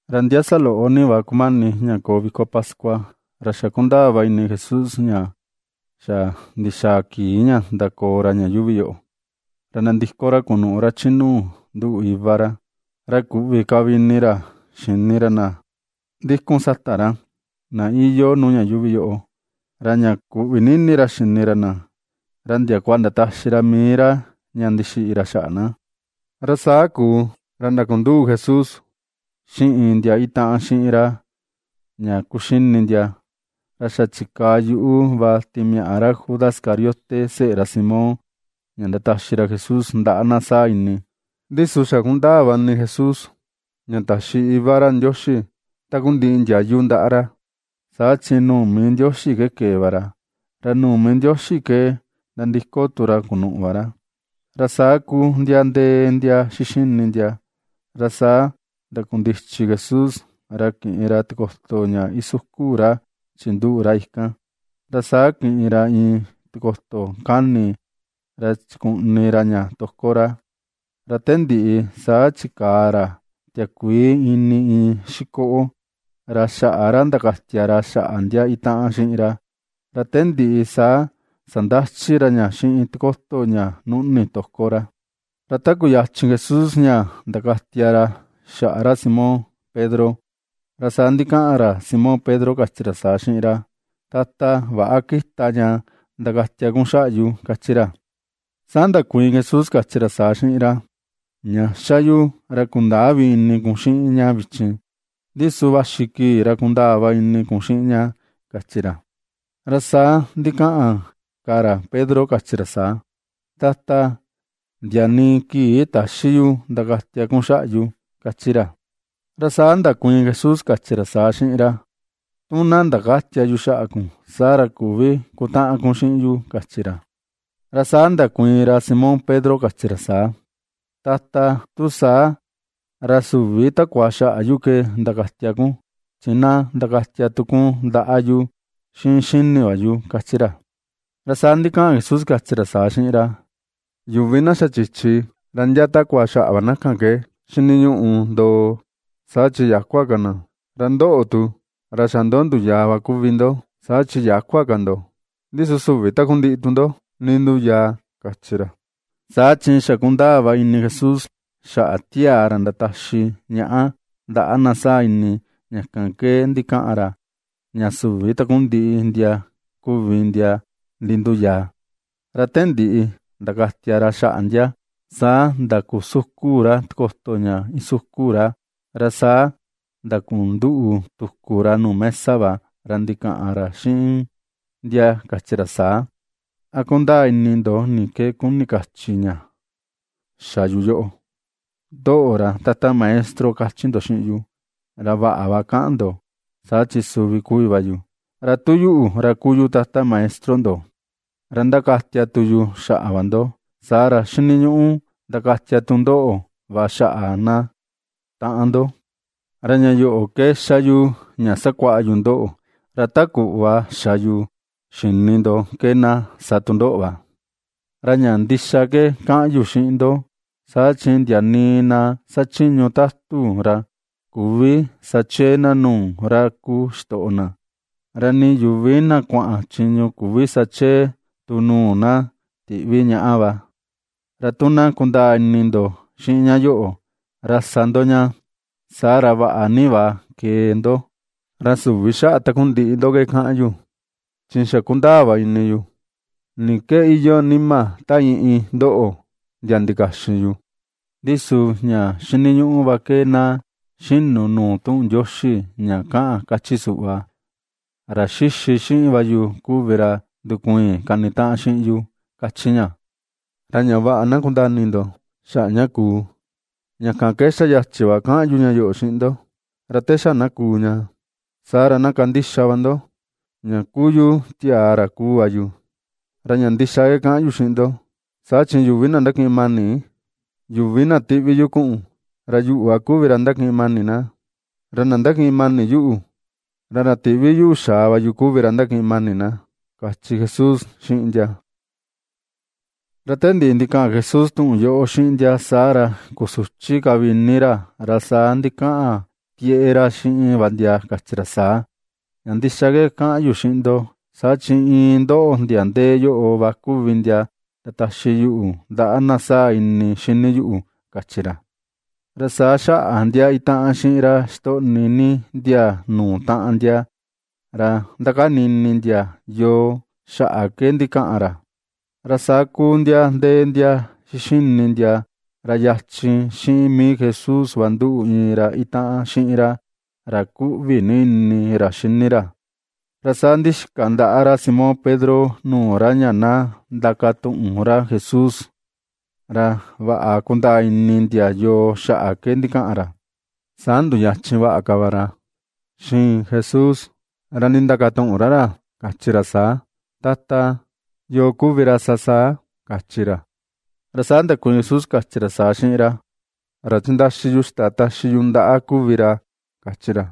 Ra ndia saloꞌo ni va kumani ña koo viko pascua, ra xa ^kundaa va ini Jesús ña xa ndixaa kii ña ndakoo ra ña yuuvi yoꞌo, ra nandiko ra kunuꞌu ra chi nuu nduꞌu Iva ra. Ra kuꞌvi ka vi ini ra xini ra na ndikun sata ra, na iyoo nuu ña yuuvi yoꞌo, ra ña kuꞌvi ni ini ra xini ra na, ra ndiakua ndataxi ra mii ra ña ndixiꞌi ra xaꞌa na. Ra saa kuu, ra ndakunduꞌu Jesús xiꞌin ndia itaꞌan xiꞌin ra ña kuxini ndia, ra xa chikaa yuꞌu va timiaꞌa ra Judas Iscariote, seꞌe ra Simón, ña ndataxi ra Jesús ndaꞌa na saa ini. Ndi su xa ^kundaa va ini Jesús ña taxi Iva ra Ndioxi takundiꞌi ndiayu ndaꞌa ra, saa chi nuu mii Ndioxi ke kee va ra, ra nuu mii Ndioxi ke nandiko tu ra kunuꞌu va ra. Ra saa kuu ndia ndee ndia xixini ndia, ra saa ndakundichi Jesús, ra kiꞌin ra tikoto ña isukun ra chinduꞌu ra kan, ra saa kiꞌin ra iin tikoto kani ra chikuꞌni ra ña toko ra. Ra te ndiꞌi saa chikaa ra tiakuii ini iin xikoꞌo, ra xaꞌa ra ndakatia ra xaꞌa ndia itaꞌan xiꞌin ra, ra te ndiꞌi saa sandachi ra ña xiꞌin tikoto ña nuꞌni toko ra. Ra ta kuyachin Jesús ña ndakatia ra xaꞌa ra Simón Pedro, ra saa ndikaꞌan ra Simón Pedro kachi ra saa xiꞌin ra: ―Tata, väꞌa kita ña ndakatia kun xaꞌa yu ―kachi ra. Saa ndakuiin Jesús kachi ra saa xiꞌin ra: ―Ña ^xa yu ra kundäa vi ini kun xiꞌin ña vichin, ndi su vaxi kii ra kundaa va ini kun xiꞌin ña ―kachi ra. Ra saa ndikaꞌan ka ra Pedro kachi ra saa: ―Tata, ndia nii kii täxi yu ndakatia kun xaꞌa yu ―kachi ra. Ra saa ndakuiin Jesús kachi ra saa xiꞌin ra: ―Tu na ndakätia yu xaꞌa kun, saa ra küvi kutaꞌan kun xiꞌin yu ―kachi ra. Ra saa ndakuiin ra Simón Pedro kachi ra saa: ―Tata, tu saa, ra süvi takua xaꞌa yu ke ndakatia kun, chi na ndakatia tu kun ndaꞌa yu, xiꞌin xini va yu ―kachi ra. Saa ndikaꞌan Jesús kachi ra saa xiꞌin ra: ―Yuvi na xa chichi ra ndia takua xaꞌa va na kan ke xiniñuꞌu ndoo, saa chi yäkua ka na. Ra ndoꞌo tu, ra xa ndo nduyaa va kuvi ndo, saa chi yäkua ka ndo, ndi su süvi takundiꞌi tu ndo ninduyaa ―kachi ra. Saa chi ^xa kundaa va ini Jesús xaꞌa tiaa ra ndataxi ñaꞌa ndaꞌa na saa ini, ña kan ke ndikaꞌan ra, ña süvi takundiꞌi ndia kuvi ndia ninduyaa. Ra te ndiꞌi ndakatia ra xaꞌa ndia, saa ndakusukun ra tikoto ña isukun ra, ra saa ndakunduꞌu tuku ra nuu mesa va, ra ndikaꞌan ra xiꞌin ndia kachi ra saa: ―¿A ^kundaa ini ndo ni ke kuni kachi ña xa yu yoꞌo? Ndoꞌo, ra Tata Maestro kachi ndo xiꞌin yu, ra vaꞌa kaꞌan va ndo, saa chi suvi kuvi va yu. Ra tu yuꞌu, ra kuu yu Tata Maestro ndo, ra ndakatia tu yu xaꞌa va ndo, saa ra, xiniñuꞌu ndakatia tu ndoꞌo va xaꞌa na taꞌan ndo. Ra ña yoꞌo ke ^xa yu ña sakuaꞌa yu ndoꞌo, ra ta kuꞌva xa yu xi̱nì ndo ke na sa tu ndoꞌo va. Ra ña ndixa ke kaꞌan yu xiꞌin va ndo, saa chi ndia nii na xachiñu tatu, ra küvi sa chee na nuu ra kuu xitoꞌo na, ra nii yuvi na kuaꞌan chiñu küvi sa chee tu nuu na tiꞌvi ñaꞌa va. Ra tu na kundaa ini ndo xiꞌin ña yoꞌo, ra sa ndo ña, saa ra vaꞌa ni va kee ndo. ’Ra süvi xaꞌa takundiꞌi ndo ke kaꞌan yu, chi xa kundaa va ini yu ni ke iyoo nima ta iin iin ndoꞌo, ndia ndikaxin yu. Ndi su ña xiniñuꞌu va ke na xinu nuu tuꞌun Ndioxi ña kaꞌan kachi suꞌva: “Ra xixi xiꞌin va yu kuvi ra ndukuiin kanitaꞌan xiꞌin yu”, kachi ña. Ra ña vaꞌa na kundaa ini ndo xaꞌa ña kuu, ña kan ke xa yachi va kaꞌan yu ña yoꞌo xiꞌin ndo, ra te xa na kuu ña, saa ra na kandixa va ndo, ña kuu yu tiaa ra kuu va yu. Ra ña ndixa ke kaꞌan yu xiꞌin ndo, saa chi yuvi na ndakiꞌin mani yuvi na ^tiꞌvi yu kuꞌun, ra yuꞌu va kuvi ra ndakiꞌin mani na; ra na ndakiꞌin mani yuꞌu, ra ra tiꞌvi yuꞌu xaa va yu kuvi ra ndakiꞌin mani na ―kachi Jesús xiꞌin ndia. Ra te ndiꞌi ndikaꞌan Jesús tuꞌun yoꞌo xiꞌin ndia, saa ra kusuchi ka vi ini ra, ra saa ndikaꞌan tieꞌe ra xiꞌin va ndia kachi ra saa: ―Ña ndixa ke kaꞌan yu xiꞌin ndo, saa chi iin ndoꞌo ndia ndee yoꞌo va kuvi ndia ndataxi yuꞌu ndaꞌa na saa ini xini yuꞌu ―kachi ra. Ra saa xaꞌa ndia itaꞌan xiꞌin ra xitoꞌni ndia nuu taꞌan ndia, ra ^ndakani ini ndia yoo xaꞌa ke ndikaꞌan ra. Ra saa kuu ndia ndee ndia xixini ndia, ra yachin xiꞌin mii Jesús va nduꞌu iin ra itaꞌan xiꞌin ra, ra ^kuꞌvi ni ini ra xini ra. Ra saa ndixika ndaꞌa ra Simón Pedro nuu ra ña na ndakatuꞌun ra Jesús, ra vaꞌa kundaa ini ndia yoo xaꞌa ke ndikaꞌan ra. Saa nduyachin vaꞌa ka va ra xiin Jesús, ra ndindakatuꞌun ra ra, kachi ra saa: ―Tata, ¿yoo kuvi ra sa saa? ―kachi ra. Ra saa ndakuiin Jesús kachi ra saa xiꞌin ra: ―Ra chindaxi yu ixta taxi yu ndaꞌa kuvi ra ―kachi ra.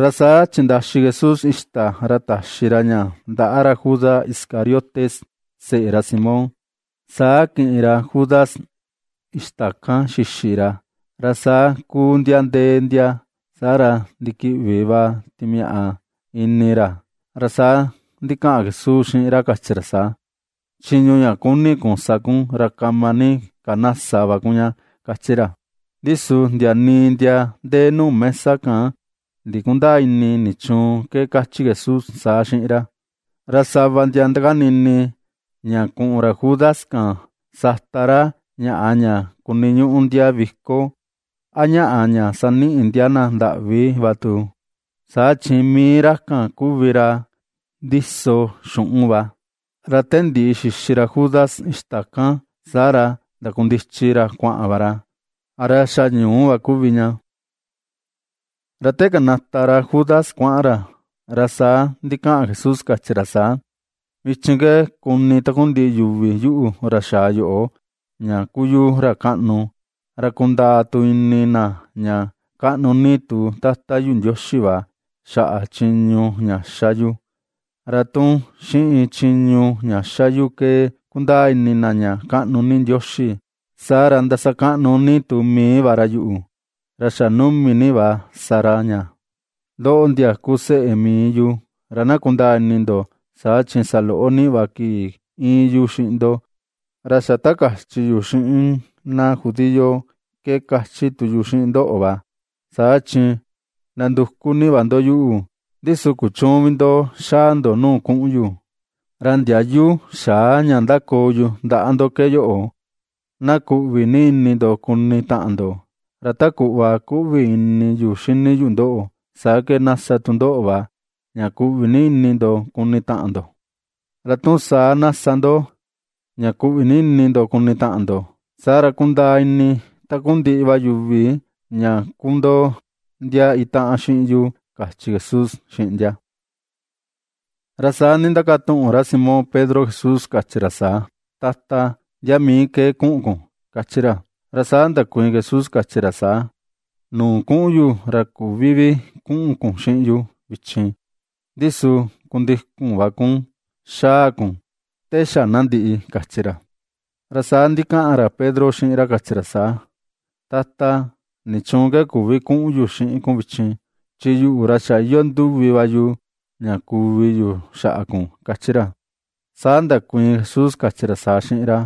Ra saa chindaxi Jesús ixta, ra taxi ra ña ndaꞌa ra Judas Iscariote, seꞌe ra Simón. Saa kiꞌin ra Judas ixta kan xixi ra, ra saa kuu ndia ndee ndia, saa ra ndikiꞌvi va timiaꞌa ini ra. Ra saa ndikaꞌan Jesús xiꞌin ra kachi ra saa: ―Chiñu ña kuni kun sa kun, ra kama ni ka na sa va kun ña ―kachi ra. Ndi su ndia nii ndia ndee nuu mesa kan ndikundäa ini, nichuun ke kachi Jesús saa xiꞌin ra. Ra sava ndia ndakani ini, ña kuꞌun ra Judas kan sata ra ñaꞌa ña kuniñuꞌu ndia viko, a ñaꞌa, ña saniꞌi ndia na ndaꞌvi va tu, saa chi mii ra kan kuvi ra ndiso xuꞌun va. Ra te ndiꞌi xixi ra Judas ixta kan, saa ra ndakundichi ra kuaꞌan va ra. Ra xa ñuu va kuvi ña. Ra te kanata ra Judas kuaꞌan ra, ra saa ndikaꞌan Jesús kachi ra saa: ―Vichin ke ^kuni takundiꞌi yuvi yuꞌu ra xaa yoꞌo, ña kuu yu ra kaꞌnu, ra kundaa tu ini na ña kaꞌnu ni tu Tata yu Ndioxi va, xaꞌa chiñu ña ^xa yu. Ra tu xiꞌin chiñu ña ^xa yu ke kundaa ini na ña kaꞌnu ni Ndioxi, saa ra ndasakaꞌnu ni tu mii va ra yuꞌu, ra xa numi ni va sa ra ña. Ndoꞌo, ndia kuu seꞌe mii yu, ra na kundaa ini ndo, saa chi saloꞌo ni va kii íin yu xiꞌin ndo, ra xa ta kachi yu xiꞌin na judío ke ^kachi tu yu xiꞌin ndoꞌo va: Saa chi nanduku ni va ndo yuꞌu, ndi su kuchüun vi ndo xaa ndo nuu kuꞌun yu. Ra ndiayu xaa ña ^ndakoo yu ndaꞌa ndo ke yoꞌo: na kuꞌvi ni ini ndo kuni taꞌan ndo. Ra ta kuꞌva ^kuꞌvi ini yuꞌu xini yu ndoꞌo, saa ke na sa tu ndoꞌo va, ña kuꞌvi ni ini ndo kuni taꞌan ndo. Ra tu saa na sa ndo, ña kuꞌvi ni ini ndo kuni taꞌan ndo, saa ra kundaa ini takundiꞌi va yuvi ña kuu ndo ndia itaꞌan xiꞌin yu ―kachi Jesús xiꞌin ndia. Ra saa ndindakatuꞌun ra Simón Pedro Jesús kachi ra saa: ―Tata, ¿ndia mii ke kuꞌun kun? ―kachi ra. Ra saa ndakuiin Jesús kachi ra saa: ―Nuu kuꞌun yu, ra küvi vi kuꞌun kun xiꞌin yu vichin, ndi su kundikun va kun xaa kun te xa na ndiꞌi ―kachi ra. Ra saa ndikaꞌan ra Pedro xiꞌin ra kachi ra saa: ―Tata, ¿nichuun ke küvi kuꞌun yu xiꞌin kun vichin? Chi yuꞌu, ra xa iyoo nduvi va yu ña kuvi yu xaꞌa kun ―kachi ra. Saa ndakuiin Jesús kachi ra saa xiꞌin ra: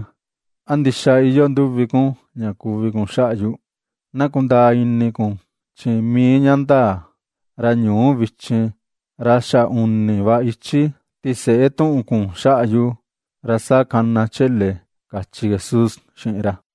―¿A ndixa iyoo nduvi kun ña kuvi kun xaꞌa yu? Na kundani kun chi mii ña ndaa, ra ñuu vichin, ra xa uni va ichi tiseꞌe tuꞌun kun xaꞌa yu, ra saa kana chele ―kachi Jesús xiꞌin ra.